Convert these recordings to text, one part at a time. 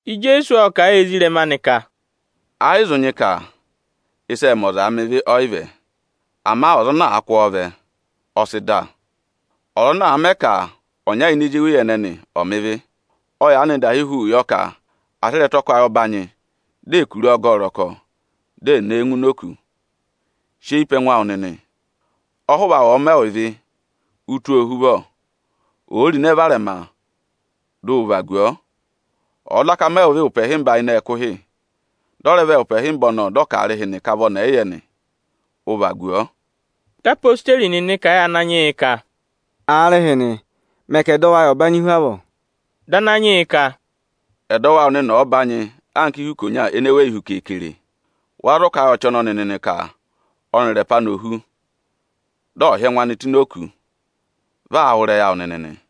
Ijeesu ộ kà a yị ezirẹma anị ka, “Ẹ yị zụ nyị ka ịsị ẹẹ̄ mẹ ọzaa mẹ ịvị, ọ yị vẹ; ama ọza ana àa kụ́ ọọ vẹ, ọ sị dà. Ọza ana àa mẹ ka ọnya ini ezi eweyi ẹnẹnị ọ̀ mẹ ịvị, ọ yaanị dahi huu yọ ka à sị ịrẹtọkwayị ọbanyị, di è kuru ọọ gẹ ẹ ọrọkọ, di è ne e ngụ oku. Sị eyi pe ẹngụ awụ nịnị! Ọhụva awụ ọ̀ọ rị ịvị awụ, ụ tụ́ ọọ ohuvọ! Òo ro ịnẹ varẹma, dị ụ vagu ọọ! Ọ̀ọ daka rị ịvị awụ ụpẹ ịhịmba ịnị ẹkụhị, dị ọ rẹ vẹ ụpẹ ịhịmba ọnọọ dị ọ ka aarịhịnị ka vị ọnị ọ̀ yị yẹ nị, ụ vagu ọọ!” Dị odeyi nịnị kà a yị Ananyị yị ka, “Aarịhịnị, mẹ ka ẹdọwụ ayị ọ̀ banyị hu avọọ!” Dị Ananyị yị ka, “Ẹdọwụ awụ nịnị ọ̀ọ banyị anka ihu ikonya ene weyi hu keekere, wa zụ kà a yị ọchị ọnọnị nịnị ka ọnịrị ẹpa anị ò hu, dị ọ̀ hị́ ẹngụ anị tụ́ ini òkū, vị aa wụ́ ịrẹyị awụ nịnị nị.”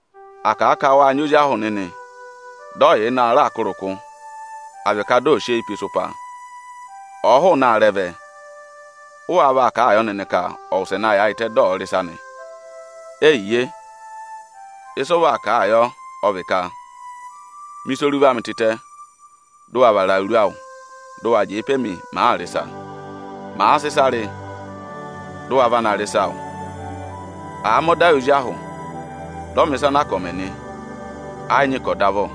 “À kà a ka wâ nyị ozi ahụ nịnị, dị ọ yà ịnị aarẹ aa kụ́ ịrịkụ, à vị ka dị ọ̀ọ sị eyii pe ịsụpa nị, ọ̀ọ hụụnị aarẹ vẹ, ụ wáá vaa kà a yọ nịnị ka ọ̀ wụsẹ na yaayịtẹ, dị ọ̀ọ rị ịsa nị? Eyiye! Ịsị ụ vaa kà a yọ, ọ vị ka: ‘Mẹ ịsa oruva amị tịtẹ mị! Dị ụ wa vara awuru awụ dị ụ wa jẹẹ pe mi, màaa rị ịsa! Màa sị ịsa rị, dị ụ wa va na rị ịsa awụ!’ Àa mẹ ọda yị ozi ahụ, dị ọ mẹ̀ ịsa ana a ka ọ̀ mẹ nị, ẹ yị nyị ka ọ̀ dọ avọ.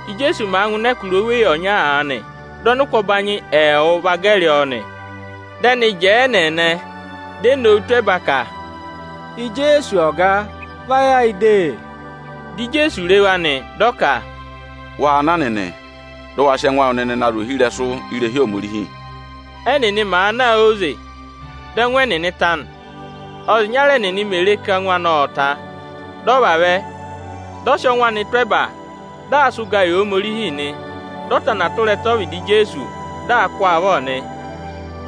Íjeesu màa ngụ ịnị ẹkụra oweyi ọnya aanị, dị ọnịkụ ọbanyị ẹẹwụ va gẹrị ọọ nị. Dị ẹnịnị jẹẹ ẹnẹẹnẹ, di e nowu tụ́ ẹba ka, “Ijeesu Ọga! Vá ayị ayị de!” Dị Ijeesu re wa nị, dị ọ ka, “Waa na nịnị, dị ụ wa sị ẹngụ awụ nịnị na zụ̀ ohirẹsụ irehi Ohomorihi!” Ẹ́nịnị màa na óze, dị ẹngụ ẹnịnị ta nị. Ọ́za ịnyara ẹnịnị mè re ka ẹngụ anị ọ́ọ ta, dị ọ vavẹ, dị ọ sị ọngwẹ anị tụ́ ẹba, dị aa sị ụgaa yị Ohomorihi nị. Dị ọ tana tụra ẹtẹ ọ́vịdị Ijeesu, dị aa kụ́ ọọ avọ nị.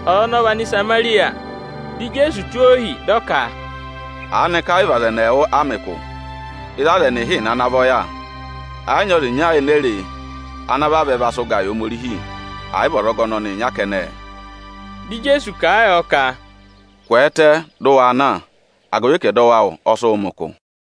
Ọza ọnọọ vị Anịsamarịya. Dị Ijeesu tụ́ ohi, dị ọ ka, “Aanịka ẹ yị vị aza ẹnị ẹẹwụ a mẹ ụkụ? Ịzị aza ẹnị ịhịịna ana vọ yà? Ẹ yị nyị ọza ịnya ene e re ana vavẹ va sị ụga yị Ohomorihi, ẹ̀ yị vị ọzọga ọnọnị ịnya kẹnẹẹ?” Dị Ijeesu kà a yọ ka, “Kwẹẹtẹ, dị ụ wa na, agụvị ka ẹdọwụ awụ ọ sị wụ mẹ ụkụ!”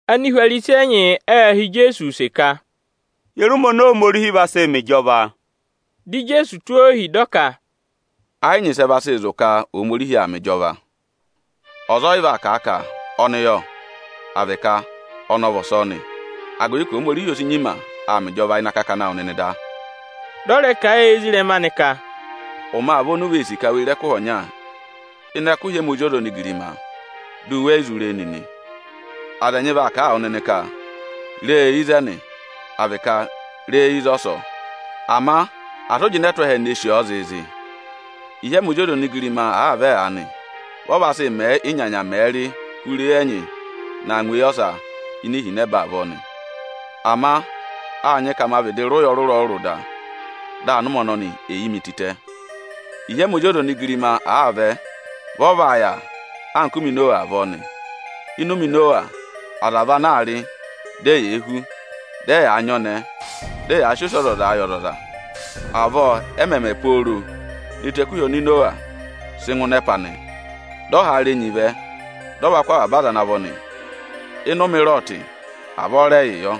Anihwarisi ẹnyị ệ họ̀ Ijeesu use ka, “Ye re ụmẹ oni Ohomorihi vaa sị mẹ ịjọva?” Dị Ijeesu tụ́ ohi, dị ọ ka, “Ẹ yị nyị ịsị ẹ vaa sị zụ̀ ka Ohomorihi aa mẹ ịjọva. Ọza ọ yị vaa kà a ka: ‘Ọnị yọ!’ à vị ka: ‘Ọnị ọ vị ọsọọ nị!’ Agụvị ka Ohomorihi o si nyima aa mẹ ịjọva ịnị akakana awụ nịnị da.” Dị ọ rẹ kà a yị ezirẹma anị ka, “Ụmẹ aa vẹ oni u vee sì ka we re ẹkụhị ọnya ịnị ẹkụhị ẹmị Ozi ọza onigirima, di u we yi zụ re e nịnị. Aza ẹnyị vaa kà a wụ nịnị ka: ‘Re e ịzẹnị!’ à vị ka: ‘Re e ịzọsọọ!’ Ama asị ụ jịnẹ tụ́ ẹhẹ ne sì ọ zịịzị nịnị! Ịhị ẹmị Ozi ọza onigirima àaa vẹ aanị, vị ọ vaa sị mẹẹ ị́nyanya mẹ̀ẹ̄ rị hụrẹ eyi ẹnyị naa ngụ eyi ọsa ini ihinẹba avọọ nị. Ama â nyị ka ma vịdị rị ụya ọrụrụ-ọrụrụ da, dị anụmẹ ọnọnị è yi mi tịtẹ. Ịhị ẹmị Ozi ọza onigirima àaa vẹ, vị ọ vaa yà anka ụmẹ Inowa avọọ nị. Ịnị ụmẹ Inowa, aza vị ana aa rị, di eyee hú, dị anọrụ aa nyị ọnẹẹ, dị anẹẹ aa vá anọrụ. Avọọ ẹ mẹ̀ mẹ pooro ne tù ẹkụhị oni Inowa sị ngụ ịnị ẹpa nị. Dị ọhaara enyi vẹ, dị ọ va kụ́ avaba aza ana vọ nị. —19.25Ịnị ụmẹ Ịrọọtị, avọọ rẹ yịị yọ.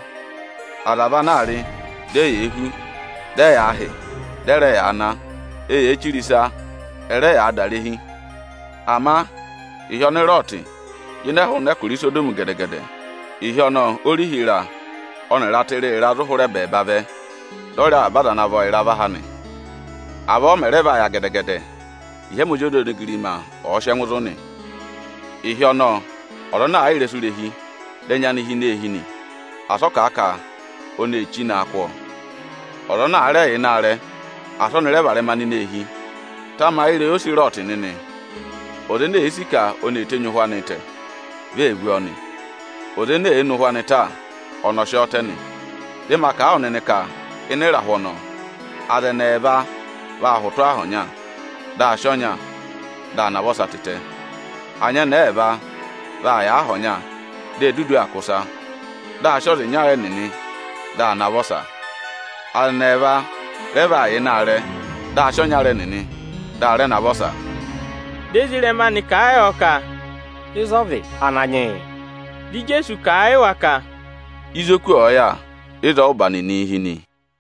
Aza vị anaa rị, di eyee hú, dị ẹyaa hị́, dị ẹ rẹ yaa ná; eyee chire ịsa, ẹ rẹ yaa dà irehi. Ama ịhị ọnị Ịrọọtị jịnẹ hụụnị ẹkụra Isodọmị gẹdẹ-gẹdẹ, ịhị ọnọọ orihi ịra ọnịrị ata ịra-ịra zụ̀ hụrẹ ẹbẹẹba vẹ dị ọ rị avaba aza ana vọ ịra và ha nị. Avọọ ọ mẹ̀ rẹ vaa yà gẹdẹ-gẹdẹ, ịhị ẹmị Ozi ọza onigirima ọ̀ọ sị ẹngụ zụ̀ nị. Ịhị ọnọọ, ọza ana àa yà ịrẹsụ irehi, dị ẹnya anị hi ini eehi nị, asị ọ kà a ka oni èe chí naa kụ́ ọọ! Ọza ana àa rẹ yà ịnị aarẹ, asị ọnị rẹ varẹma nọ ini eehi! Tamayị ịrẹyị ose Ịrọọtị nịnị o! Ọza ene èe sì ka oni èe tenyi ụhwẹ anịị tẹ, vi ee vú ọọ nị. Ọza ene èe ne ụhwẹ anị ta, ọnị ọ sị ọọ tẹ nị. Dị ma kà a wụ nịnị ka ịnị ịrahụ ọnọọ, aza ẹnị ẹẹva vaa hụtụ aha ọnya, dị a sị ọnya, dị a navọ ọsa tịtẹ. Anyẹnẹẹ ẹẹva vaa yà aha ọnya, di e dudu aa kwọ̀ ịsa; dị a sị ọza ịnya ẹnịnị, dị a navọ ọsa. [Aza ẹnị ẹẹva rẹ vaa yà ịnị aarẹ, dị a sị ọnyara ẹnịnị, dị a rẹ navọ ọsa.”] Dị ezirẹma anị kà a yọ ka, “Ịzọọ vị, Ananyị yị?” Dị Ijeesu kà a yị wa ka: “Ịzị oku ọ̀ọ yà, ịzọọ ụ́ba nịnịị̄ hi nị.”